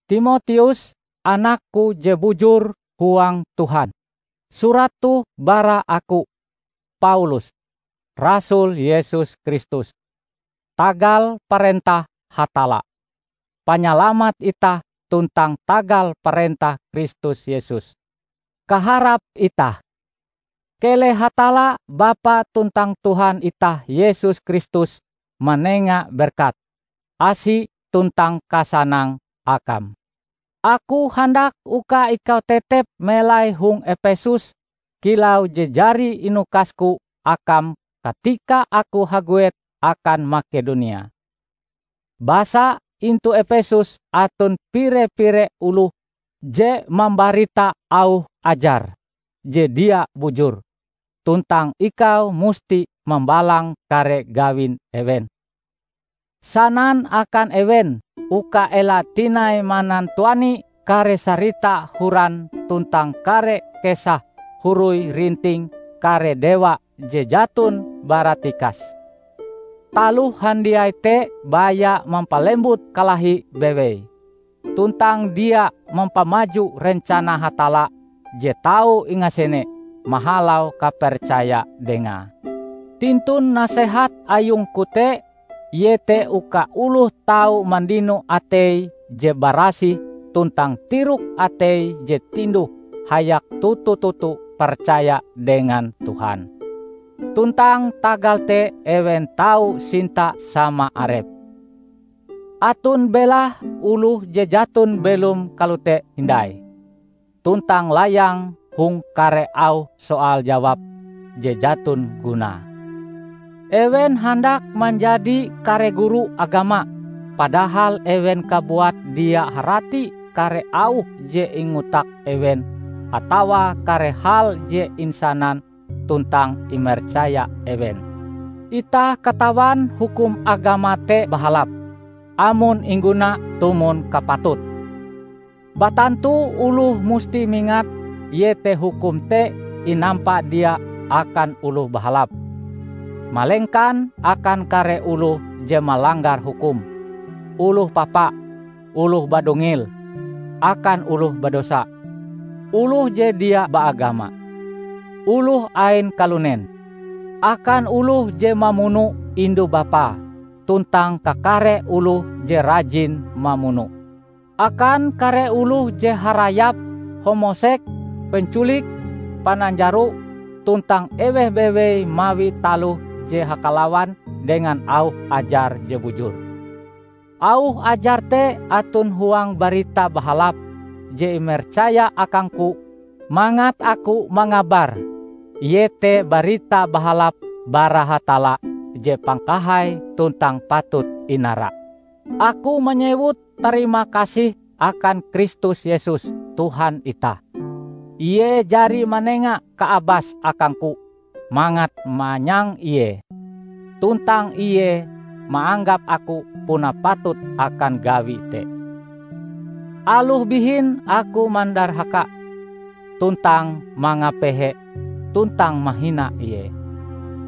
Timoteus, anakku je bujur huang Tuhan! Surat toh bara aku, Paulus, rasul Yesus Kristus tagal parentah Hatalla, Panyalamat itah tuntang tagal parentah Kristus Yesus, kaharap itah. Keleh Hatalla Bapa tuntang Tuhan itah Yesus Kristus manenga berkat, asi tuntang kasanang akam. Aku handak uka ikau tetep melai hong Epesus kilau je jari inukasku akam katika aku haguet akan Makedonia. Basa, intu Epesus aton pire-pire oloh je mambarita auh ajar je dia bujur, tuntang ikau musti mambalang kare gawin ewen. Sanan akan ewen uka ela tinai manantuani kare sarita horan tuntang kare kesah huroi-rinting kare dewa je jaton baratikas. Taloh handiai te baya mampalembut kalahi bewei, tuntang dia mampamaju rencana Hatalla je tau ingasene mahalau kapercaya Dengae. Tintun nasehat ayungku te iete uka oloh tau mandino atei je barasih tuntang tirok atei je tinduh hayak toto-toto percaya dengan Tuhan, tuntang tagal te ewen tau sinta sama arepe. Aton belahe oloh je jaton belom kalote hindai, tuntang layang hong kare auh soal-jawab je jaton gunae. Ewen handak manjadi kare guru agama padahal ewen kabuat dia harati kare auh je ingotak ewen atawa kare hal je insanan tuntang imercaya ewen. Itah katawan hukum agama te bahalap, amon ingguna tumon kapatute. Batantu oloh musti mingat iete hukum te inampa dia akan oloh bahalap, malengkan akan kare oloh je malanggar hukum, oloh papa, oloh badungil, akan oloh badosa, oloh je dia baagama, oloh ain kalunen, akan oloh je mamuno indu bapae, tuntang kakare oloh je rajin mamuno, akan kare oloh je harayap, homoseks, penculik, pananjaro; tuntang eweh bewei mawi taloh je hakalawan dengan auh ajar je bujur. Auh ajar te aton huang Barita Bahalap je imercaya akangku mangat aku mangabare, iete Barita Bahalap bara Hatalla je pangkahai tuntang patut inara. Aku manyewut tarimakasih akan Kristus Yesus Tuhan itah. Ie jari manenga kaabas akangku mangat manyang Ie, tuntang Ie maanggap aku puna patut akan gawi te, aloh bihin aku mandarhaka tuntang mangapehe tuntang mahina Ie.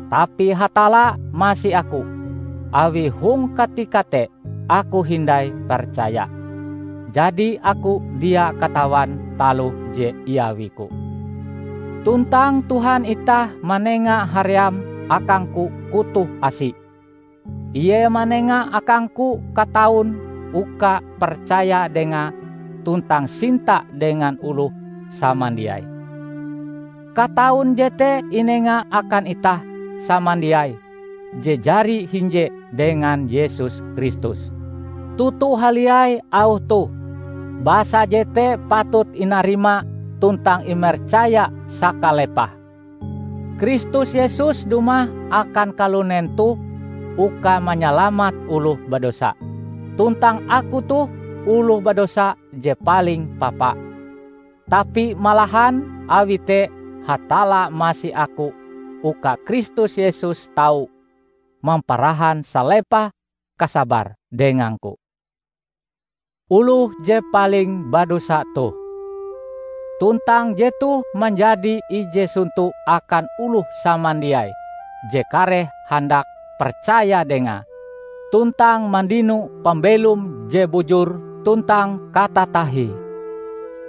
Tapi Hatalla masi aku awi hong katika te aku hindai percaya, jadi aku dia katawan taloh je iawiku. Tuntang Tuhan itah manenga haream akangku kutoh asi. Ie manenga akangku kataun uka percaya Dengae tuntang sinta dengan oloh samandiai. Kataun jete inenga akan itah samandiai je jari hinje dengan Yesus Kristus. Toto haliai auh toh -- basa jete patut inarima tuntang imercaya sakalepahe --: "Kristus Yesus dumah akan kalunen toh uka manyalamat oloh badosa." Tuntang aku toh oloh badosa je paling papa. Tapi malahan awi te Hatalla masi aku uka Kristus Yesus tau mamparahan salepah kasabare dengangku, oloh je paling badosa toh. Tuntang jetoh manjadi ije sonto akan oloh samandiai je kareh handak percaya Dengae tuntang mandino pambelom je bujur tuntang katatahie.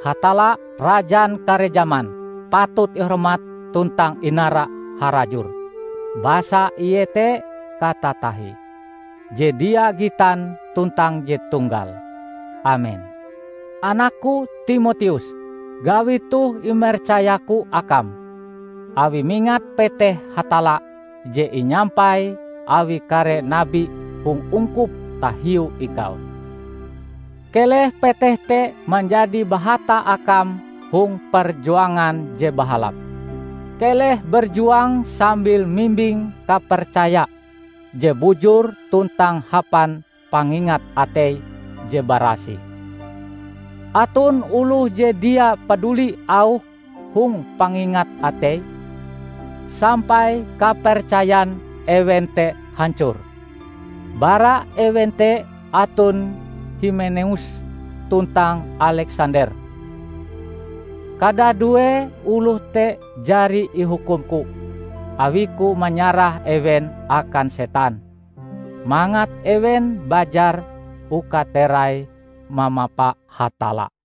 Hatalla, Rajan kare jaman, patut ihormat tuntang inara harajur, basa Ie te katatahie, je dia gitan tuntang je Tunggal. Amen! Anakku Timoteus! Gawi toh imercayaku akam, awi mingat peteh Hatalla je inyampai awi kare nabi hong ungkup tahiu ikau. Keleh peteh te manjadi bahata akam hong perjuangan je bahalap. Keleh berjuang sambil mimbing kapercaya je bujur tuntang hapan pangingat atei je barasih. Aton oloh je dia paduli auh hong pangingat ateie, sampai kapercayan ewen te hancor. Bara ewen te aton Himeneus tuntang Aleksander. Kadadue oloh te jari ihukumku awiku manyarah ewen akan setan, mangat ewen bajar uka terai mamapa Hatalla.